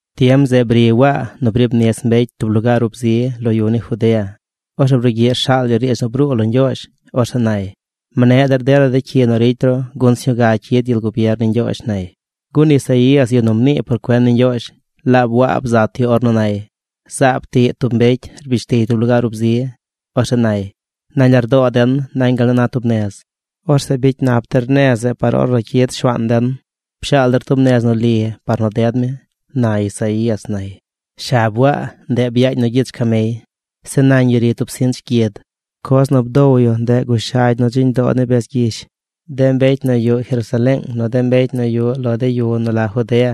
Tiem zeꞌ bri Waa nu briib nis mbecy tub lugaar ub zi lo yu ni Judea. Orzeꞌ brugyiꞌ rshaal yu riidz nu bruu lo Ñgyoozh. Orzeꞌ nay: ―Mneꞌ der dela cyi nu ricy ru gun sñuu ga cyid gyel gubier ni Ñgyoozh ―nay. Gun Isaías, yu nu mnii por cuen ni Ñgyoozh, laab Waa bzat yu ornu nay: Zaab tiꞌ tub mbecy. Rbish tiy tub lugaar ub zi. Orzeꞌ nay: “Nañ lardoo den nañ gal nu na tub nez. Orzeꞌ bicy nap der nez zeꞌ par ornu cyid Shuaan den. Pshaal der tub nez nu li par nu ded mi”, na Isaías, nay. Shab Waa, ndeꞌ byaañ nu gyich camey. Zeꞌ nañ yu ri tub sinch gyid. Coz nu bdow yu, ndeꞌ gushagy nu dziñ doo ni bez gyish. De mbecy nu yuꞌ Jerusaleeng, nu de mbecy nu yuꞌ lo de yu nu la Judea,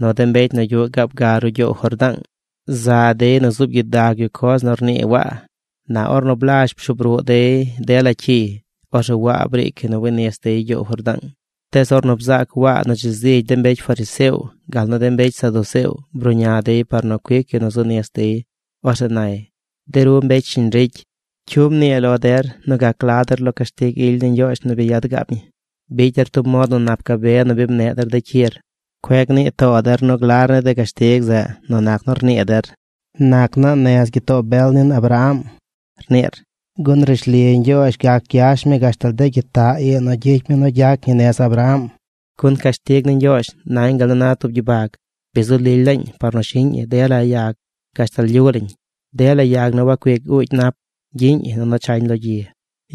nu de mbecy nu yuꞌ gaab ga ruꞌ gyoow Jordaang, za dey nu zuub gyidag yu coz nu rnii Waa. Na ornu blazh pshuub ruꞌ dey dela cyiy, orzeꞌ Waa briic yu nu wi nis dey gyoow Jordaang. Tees ornu bzaac Waa nu dzi zigy de mbecy fariseo gal nu mbecy saduceo bruꞌña dey par nu cuic yu nu zu nis dey, orzeꞌ nay: ―De ru mbecy shiñ ricy, ¿cyu mnii lo der nu gac gla der lo cashtig ily ni Ñgyoozh nu bi yad gaab ñi? Bicy der tub mod nu nap gabe nu bi mneꞌ der cyir. Cueꞌ gnii too der nu glar ni de cashtig zeꞌ nu nac nu rnii der: “Nac naa nez gyitoo bel nin Abraham”, rniir, gun rishli Ñgyoozh gac gyash mi gashtal de gyitaꞌ ii nu gyicy mi nu gyac ñi nez Abraham. Gun cashtig ni Ñgyoozh nañ gal na tub gyibag. Bi zu lily laañ par nu shiꞌñ ñi dela yag gashtal lyu lañ. Dela yag nu wacuic uugy nap, gyiꞌñ ñi nunu chañ lo gyi.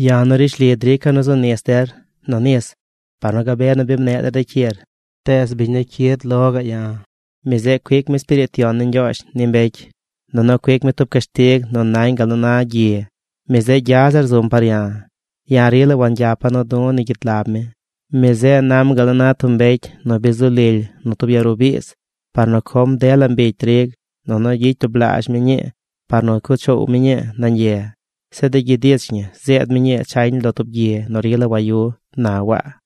’Ya̱ nu rishli drica̱ nu zu nis der nu nis par nu gabe nu bi mneꞌ der cyir, tees biñ nu cyid par lo̱, mi zeꞌ cuic mi Espiriit Yon ni Ñgyoozh ni mbecy, nunu cuic mi tub cashtig nu nañ gal nu na gyi. Mi zeꞌ gya zir zum par ya̱. Ya̱ rila wangyapa̱ du̱ ni gyid lab mi. Mi zeꞌ nam gal nu na tub mbecy nu bi zu lily nu tub ya ruꞌ biiz par nu com dela mbigy trig, nunu gyicy tublaazh mi ñii par nu cuꞌ choow mi ñii nañ ye. Zeꞌ de gyid ich ñi zeed mi ñii chañ lo tub gyi nu rila wayu ―na Waa.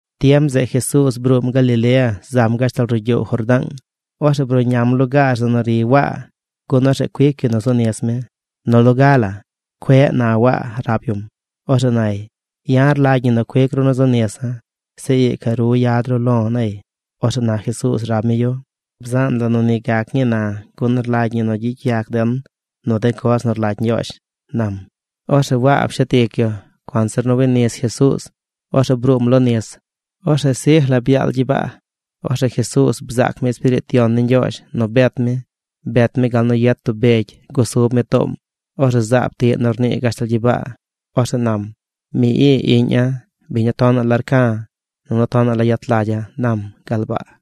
Tiem zeꞌ Jesuuz bruum Galilea zam gashtal ruꞌ gyoow Jordaang. Orzeꞌ bruꞌñam lugaar zeꞌ nu ri Waa gun orzeꞌ cuic yu nu zu nis mi. Nu loga la “Cueꞌ”, na Waa rab yum. Orzeꞌ nay: ―Ya̱ rlagy ñi nu cuic ru nu zu nisa̱. Zeꞌ ii ca ru yad ru lo̱ ―nay. Orzeꞌ na Jesuuz rab mi yu: ―Bzaan la nu ni gac ñii na, gun rlagy ñi nu gyicy yac den nu de coz nu rlagy Ñgyoozh ―nam. Orzeꞌ Waa pshet ic yu. Cuanzir nu wi nis Jesuuz, orzeꞌ bruum lo nis. Orzeꞌ sij la byaal gyibaa. Orzeꞌ Jesuuz bzaac mi Espiriit Yon ni Ñgyoozh nu bet mi. Bet mi gal nu yet tub begy gusub mi toom. Orzeꞌ zaab tiꞌ nu rnii gashtal gyibaa. Orzeꞌ nam: ―Mi ii iꞌña̱, biñ nu tonaꞌ la rca̱ nunu tonaꞌ la yet lagya̱ ―nam gal baa.